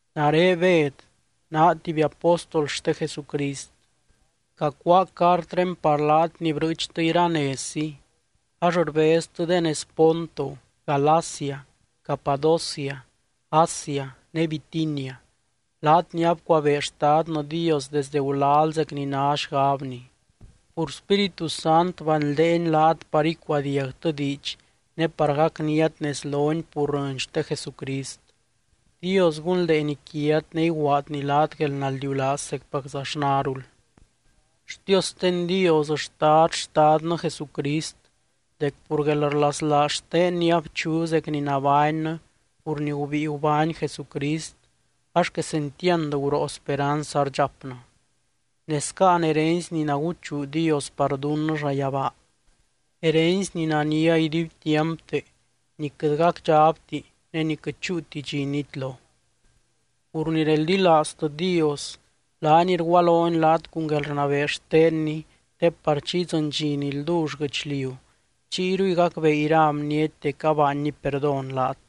Nare Bed naa tuby apóstol xte Jesucrist. Cacuáa cartré par laat ni brɨɨchtɨ iranezzi ax rbeztɨ de nez Ponto, Galacia, Capadocia, Asia ne Bitinia, laat ni abcuabee Xtadnɨ Dios desde gulal zec ni ná xgabny. Pur Spíritu Sant banldeeny laat par icuadiagtɨ diidx ne par gacniat nez lony pur rɨny xte Jesucrist. Dios gunldeeny quiat ne iguaadny laat guelnaldiulaaz zecpaczaxnarul. Xtiosten Dios xtad, Xtadnɨ Jesucrist dec pur guelrlaslaaz xtenny abchu zec ni nabánnɨ pur ni gubíi gubány Jesucrist ax quesentiand guroo speranz ardxapnɨ. Ne scáan herency ni naguchuu Dios par dunnɨ llayabaa, herency ni nania iduibtiampte ni quɨt gacdxabti ne ni quɨt chúuti dxi nitlo. Pur ni reldilaaztɨ Dios, laany rgualony laat cun guelrnabee xtenny te par chi idzɨny dxi ni ldull guɨchliu chiyruy gacbee ira bniety dec abaanny perdón laat.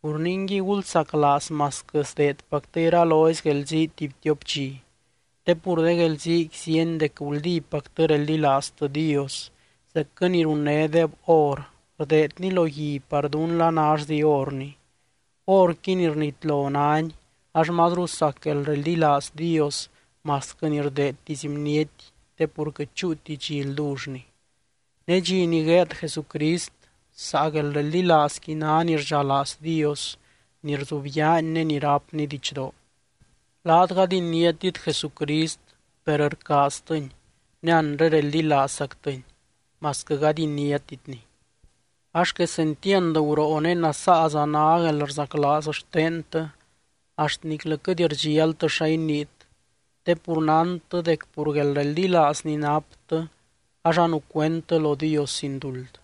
Pur ningui, gulsaclaaz masquɨ sdeedpactɨ iralozy guelzii tuby tiop dxi. Te pur de guelziiqui zíeny dec guldípactɨ reldilaaztɨ Dios zecquɨ ni runnédeb or, rdeedni lo gui par dún la nallzi orni. Orqui ni rnitlo náni ax mazru sac guelreldilaaz Dios masquɨ ni rdeedtisy bniety te pur quɨt chúuti dxi ldullni. Ne dxi ni gueed Jesucrist, saa guelreldilaazqui ná ni rdxalaaz Dios, ni rzubyaany ne ni rápny didxdoo. Laat gady iniátit Jesucrist per rcaaztɨny ne anre reldilaazzactɨny masquɨ gady iniátitny. Ax quesentiand guroo ne nasaaza ná guelrzaclaaz xtentɨ axt niclɨ quɨt rdxialtɨ xa iniit, te pur nántɨ dec pur guelreldilaaz ni naptɨ ax anucuendtɨ lo Dios sin duld.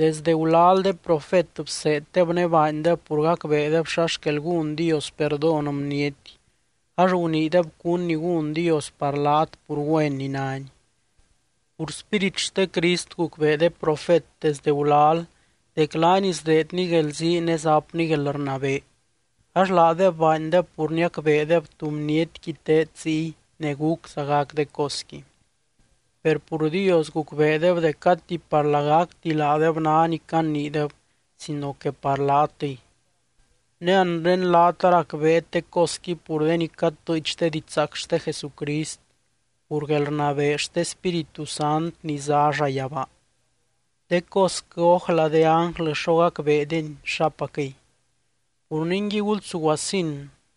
Desde gulal de profet bseeddeb ne baandeb pur gacbeedeb xa xquel gún Dios perdón bniety, ax guniideb cún ni gún Dios par laat pur güen ni nány. Pur Spírit xte Crist gucbee de profet desdɨ gulal dec laany sdeedny guelzii ne zapny guelrnabee, ax laadeb baandeb pur niacbeedeb tú bnietqui teed ziy ne gúcza gac de cosqui. Per pur Dios gucbeedeb dec gati par lagacti laadeb ná ni caniideb sino que par laatɨy. Ne anre laat aracbeet de cosqui pur de ni catɨɨch de didxzaac xte Jesucrist pur guelrnabee xte Spíritu Sant ni zá llayabaa. De cosquɨ ójla de ánglɨ xo gacbeedeny xapacquɨy. Pur ningui gulsuguasin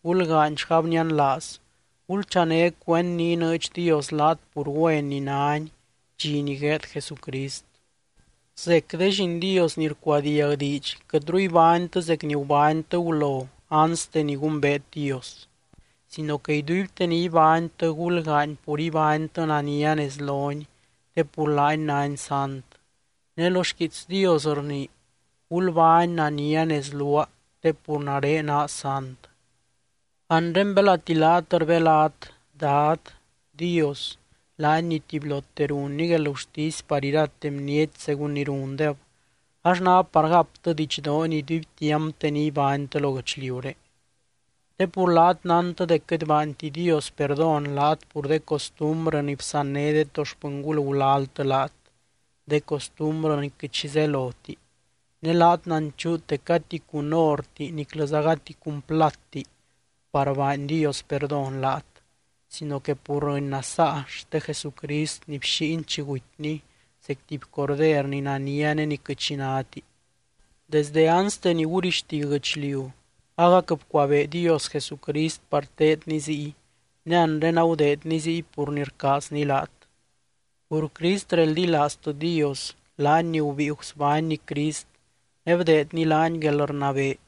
gulgaany xgabnianlaaz, gulchané cuend ni inɨɨdx Dios laat pur güen ni nány dxi ni gueed Jesucrist. Zec de lliin Dios ni rcuadiag diidx, quɨtru ibánytɨ zec ni gubánytɨ gulo anste ni gumbeet Dios. Sino que iduibte ni ibánytɨ gulgaany pur ibánytɨ nania nez lony te pur laany nány sant. Ne lo xquiits Dios rnii: “Gulbány nania nez luaa te pur nare naa sant.” Anre belati laat rbelat “Dad” Dios, laany ni tubylote runny guelgurtisy par irate bniety según ni rundeb, ax ná par gaptɨ didxdoony iduibtiampte ni ibánytɨ lo guɨchliuré. Te pur laat nántɨ dec quɨt baanti Dios perdón laat pur de costumbrɨ ni bsanné de to xpɨngul gulaltɨ laat, de costumbrɨ ni quɨt xi zeloti. Ne laat nanchuut dec gati cun orti niclɨza gati cun platti par baany Dios perdón laat sino que pur rɨny nasaa xte Jesucrist ni bxíiny chi gutyny zec tuby corder ni nania ne ni quɨt xi náti. Desdɨ anste ni gurixti guɨchliu agac bcuabee Dios Jesucrist par teedny ziy, ne anre agudeedny ziy pur ni rcaazny laat. Pur Crist reldilaaztɨ Dios, laany ni gubíi gusbánny Crist ne bdeedny laany guelrnabee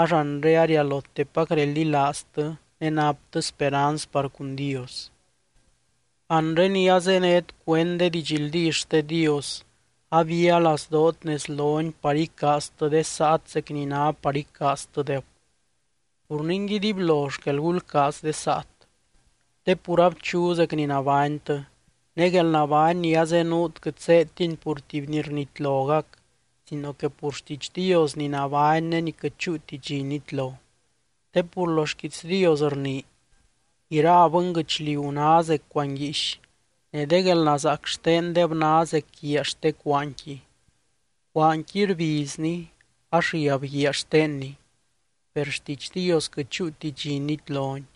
ax anre arialotepac reldilaaztɨ ne naptɨ speranz par cun Dios. Anre ni azénet cuend de didxldí xte Dios, abia lazdoot nez lony par icaaztɨ de saat zec ni ná par icaaztɨdeb. Pur ningui, dibylo xquel gulcaaz de saat. Te pur abchu zec ni nabánytɨ, ne guelnabány ni azenuut quɨt zéedtini pur tuby ni rnitlogac, sino que pur xtiidx Dios ni nabány ne ni quɨt chúuti dxi nitlo. Te pur lo xquiits Dios rnii: Ira bɨnguɨchliu ná zec cuanguiix ne de guelnazaac xtendeb ná zec guiaa xte cuaanqui. Cuaanqui rbizni ax riab guiaa xtenni, per xtiidx Dios quɨt chúuti dxi nitloni.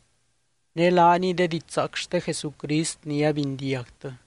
Ne laaniy de didxzaac xte Jesucrist ni abindiagtɨ.